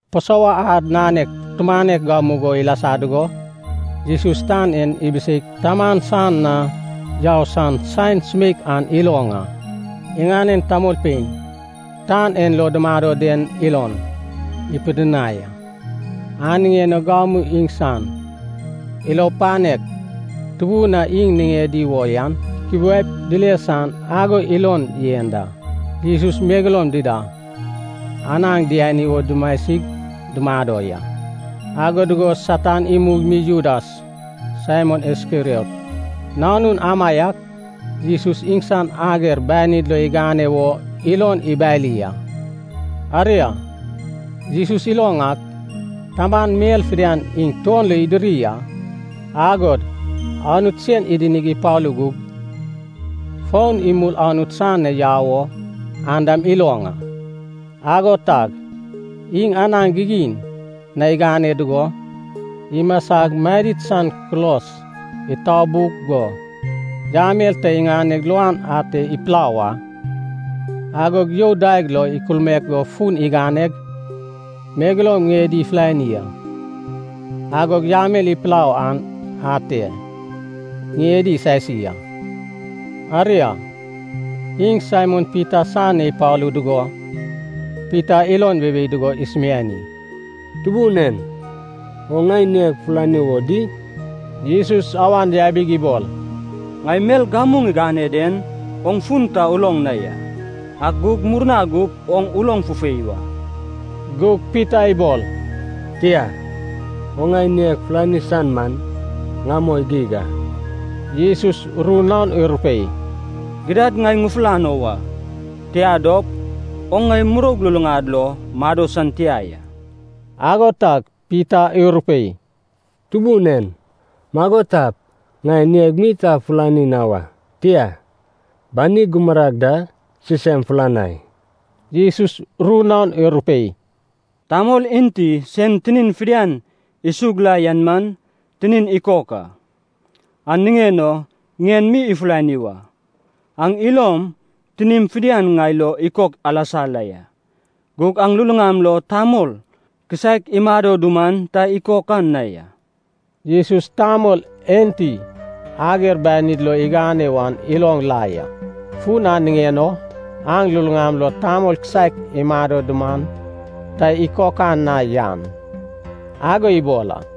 Pasova ad nanek tumanek gamugo ilasa dugo, Jesus tan en ibiseip Taman san na yau san saen sumeik an iloŋ a. Iŋanen tamolpein tan en lo dumado den ilon ipidinai a. An niŋen o gamu iŋsan ilo panek tubun a iŋ niŋedi wo yan ikubiaip dile san ago ilon yen da. Jesus megeloum dida anaŋ diani wo dumasig dumado ya. Ago dugo Satan imug mi Judas, Saimon Iskeriot nanun amaiak, Jesus iŋsan ager banid lo igane wo ilon ibali a. Aria, Jesus iloŋ ak, Taman mel fidian iŋ tuon lo idiri a, agod Anut sen idinig ipalu gug, fon imul Anut san na yau o an dam iloŋ a. Ago tag, iŋ anaŋ gigin na igane dugo, imasag madid san kulos itabug go, yamel ta iŋaneg luan ate ipulau a. Agog you daeg lo ikulmaek go fun iganeg megeloum ŋiedi ifulani a. Agog yamel ipulau an ate ŋiedi isasi a. Aria, iŋ Saimon Pita san na ipalu dugo, Pita ilon weiwei dugo isumiani, “Tubun en, oŋ ŋai ŋieg fulani wo di?” Jesus awan yabig ibol, “Ŋai mel gamu ŋigane den oŋ fun ta uloŋ na ya, ak gug murna gup oŋ uloŋ fufei wa.” Gug Pita ibol, “Tia, oŋ ŋai ŋieg fulani san man ŋamoi geig a.” Jesus ru naon irupei, “Gidad ŋai ŋufulano wa, tia dop, oŋ ŋai muroug luluŋad lo mado san tia ya.” Ago tag Pita irupei, “Tubun en, mago tap, ŋai ŋeig mi ta fulani na wa, tia, banig gumurag da sisem fulanai.” Jesus ru naon irupei, “Tamol enti sen tinin fidian isug la yan man, tinin ikok a. An niŋen o ŋien mi ifulani wa. Aŋ ilom tinim fidian ŋai lo ikok alasa la ya. Gug aŋ luluŋam lo tamol kisaek imado duman ta ikokan na ya.” Jesus tamol enti ager banid lo igane wan iloŋ la ya. Fun an niŋen o, “aŋ luluŋam lo tamol kisaek imado duman ta ikokan na yan” ago ibol a.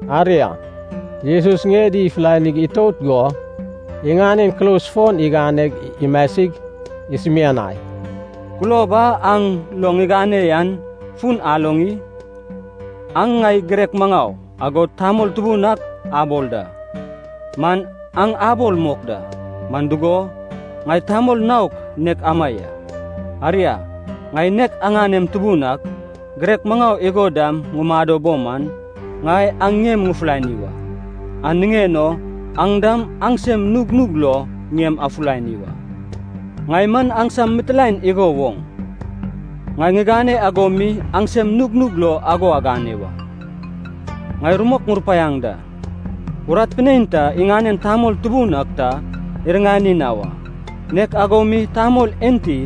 Aria, Jesus ŋiedi ifulanig itout go, iŋanen kulos fon iganeg imasig, isumianai, “Kulob a aŋ lo ŋigane yan fun aloŋ i? Aŋ ŋai Girek Maŋau, agod Tamol Tubun ak abol da. Man aŋ abol mok da, man dugo, ŋai tamol naok nek ama ya. Aria, ŋai nek aŋanem Tubun ak, Girek Maŋau igo dam ŋumado bo man, ŋai aŋ ŋiem ŋufulani a. An niŋen o aŋ dam aŋsem nugnug lo ŋiem afulani wa. Ŋai man aŋsam mitilaen igo woŋ, ŋai ŋigane ago mi aŋsem nugnug lo ago agane wa. Ŋai rumok ŋurupaiaŋ da, urat pinein ta iŋanen tamol tubun ak ta iriŋani na wa. Nek ago mi tamol enti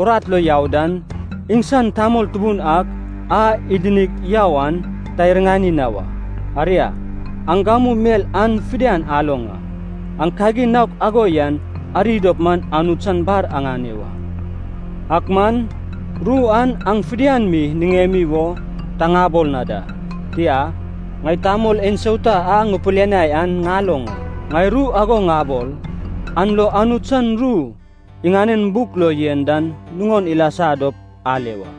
urat lo yau dan, iŋsan tamol tubun ak a idinig yau an ta iriŋani na wa. Aria, aŋ gamu mel an fidian aloŋ a. Aŋ kagin naok ago yan ari dop man, Anut san bar aŋane wa. “Ak man, ru an aŋ fidian mi niŋemi wo ta ŋabol na da. Tia, ŋai tamol ensauta a ŋupilianai an ŋaloŋ a. Ŋai ru ago ŋabol, an lo Anut san ru iŋanen buk lo yen dan nuŋon ilasa dop ale wa.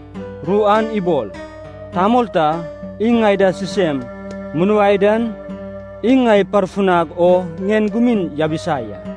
Ru an ibol, ‘Tamol ta iŋ ŋai da sisem munuai dan, iŋ ŋai iparfunag o ŋien gumin yabisa ya.’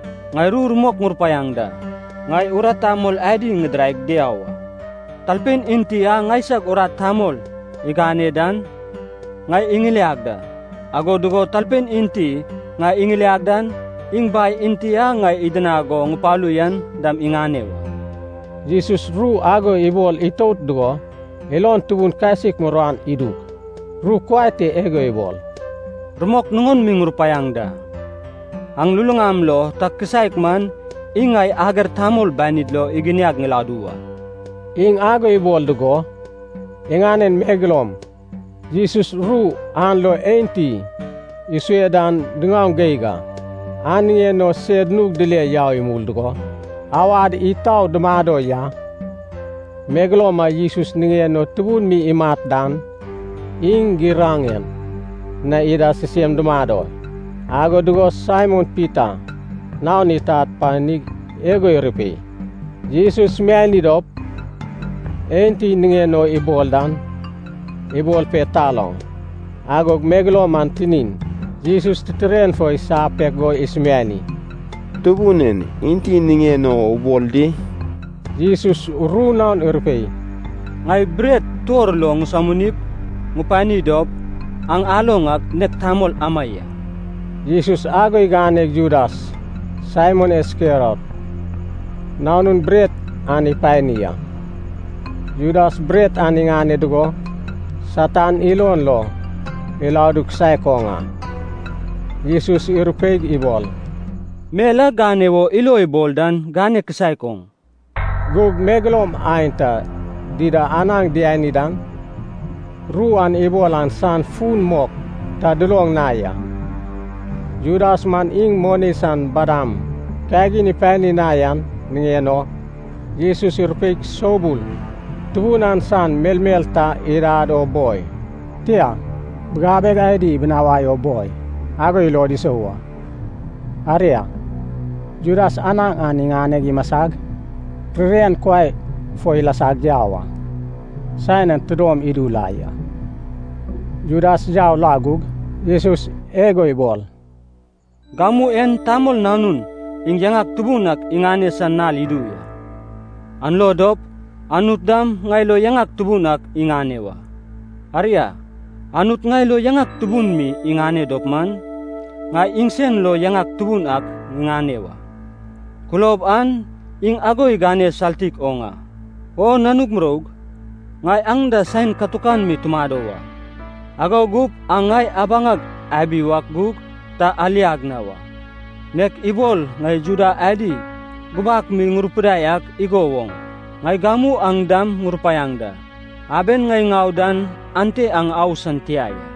Ŋai ru rumok ŋurupaiaŋ da, ŋai urat tamol adi ŋidiraig diau a. Talpein enti a ŋaisag urat tamol iŋane dan, ŋai iŋiliag da. Ago dugo talpein enti ŋai iŋiliag dan, iŋ Bai enti a ŋai idinag go ŋupalu yan dam iŋane da.” Jesus ru ago ibol itout dugo, ilon tubun kasik muruan idug, ru kuai te igo ibol, “Rumok nuŋon mi ŋurupaiaŋ da. Aŋ luluŋam lo ta kisaek man iŋ ŋai ager tamol banid lo iginiag ŋiladu wa.” Iŋ ago ibol dugo, iŋanen megeloum Jesus ru an lo enti isue dan diŋaoŋ geig a, an niŋen o sed nug dile yau imul dugo awad itau dumado ya. Megeloum a Jesus niŋen o tubun mi imat dan, iŋ giraŋen na ida sisem dumado, ago dugo Saimon Pita naon itad panig igo irupei, “Jesus sumiani dop enti niŋen o ibol dan, ibol pe taloŋ.” Agog megeloum an tinin Jesus titiren fo isapek go isumiani, “Tubun en, enti niŋen o ubol di?” Jesus ru naon irupei, “Ŋai bret tuor lo ŋisominip, ŋupani dop, aŋ aloŋ ak, nek tamol ama ya.” Jesus ago iganeg Judas, Saimon Iskeriot nanun, bret an ipani a. Judas bret an iŋane dugo, Satan ilon lo iladu kisaek oŋ a. Jesus irupeig ibol, “Mel a gane wo ilo ibol dan gane kisaek oŋ.” Gug megeloum aenta dida anaŋ diani dan, ru a ibol an san fun mok ta duloŋ na ya. Judas man iŋ moni san badam kagin ipani na yan niŋen o, Jesus irupeip soubul tubun an san melmel ta idad o boi, tia, bigabeg adi ibinawai o boi, ago ilod isou a. Aria, Judas anaŋ an iŋaneg imasag, ririan kuai fo ilasag yau a. Saen an tidom idu la ya. Judas yau la gug, Jesus igo ibol, “Gamu en Tamol Nanun iŋ yaŋak tubun ak iŋane san nal idu ya. An lo dop, Anut dam ŋai lo yaŋak tubun ak iŋane wa. Aria, Anut ŋai lo yaŋak tubun mi iŋane dop man, ŋai iŋsen lo yaŋak tubun ak ŋiŋane wa. Kulob an iŋ ago igane saltik oŋ a. O nanug muroug, ŋai aŋ da saen katukan mi tumado wa. Ago gup aŋ ŋai abaŋag abi wak gug ta aliag na wa. Nek ibol ŋai Juda adi gubak mi ŋurupidai ak igo woŋ, ŋai gamu aŋ dam ŋurupaiaŋ da, aben ŋai ŋau dan ante aŋ au san tia ya.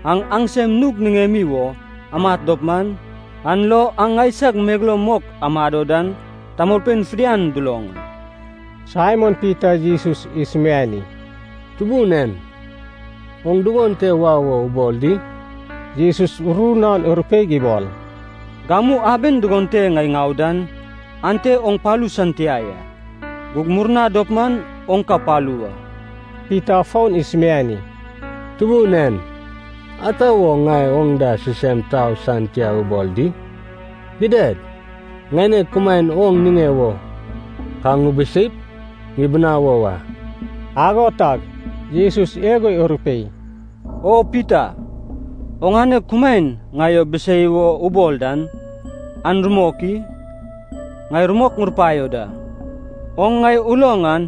Aŋ aŋsem nug niŋemi wo amat dop man, an lo aŋ ŋaisag megeloum mok amado dan tamolpein fidian duloŋ a.” Saimon Pita Jesus isumiani, “Tubun en, oŋ dugon te wau wo ubol di?” Jesus ru naon irupeig ibol, “Gamu aben dugon te ŋai ŋau dan, ante oŋ palu san tia ya, gug murna dop man, oŋ ka palu wa.” Pita fon isumiani, “Tubun en, ata wo ŋai oŋ da sisem tau san tia ubol di? Gidad, ŋaineg kumaen oŋ niŋe wo ka ŋubiseip, ŋubinawo wa.” Ago tag Jesus igo irupei, “O Pita, oŋane kumaen ŋai o bisei wo ubol dan, an rumok i? Ŋai rumok ŋurupaio da, oŋ ŋai uloŋ an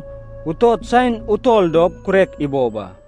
utot saen utol dop, kurek ibob a.”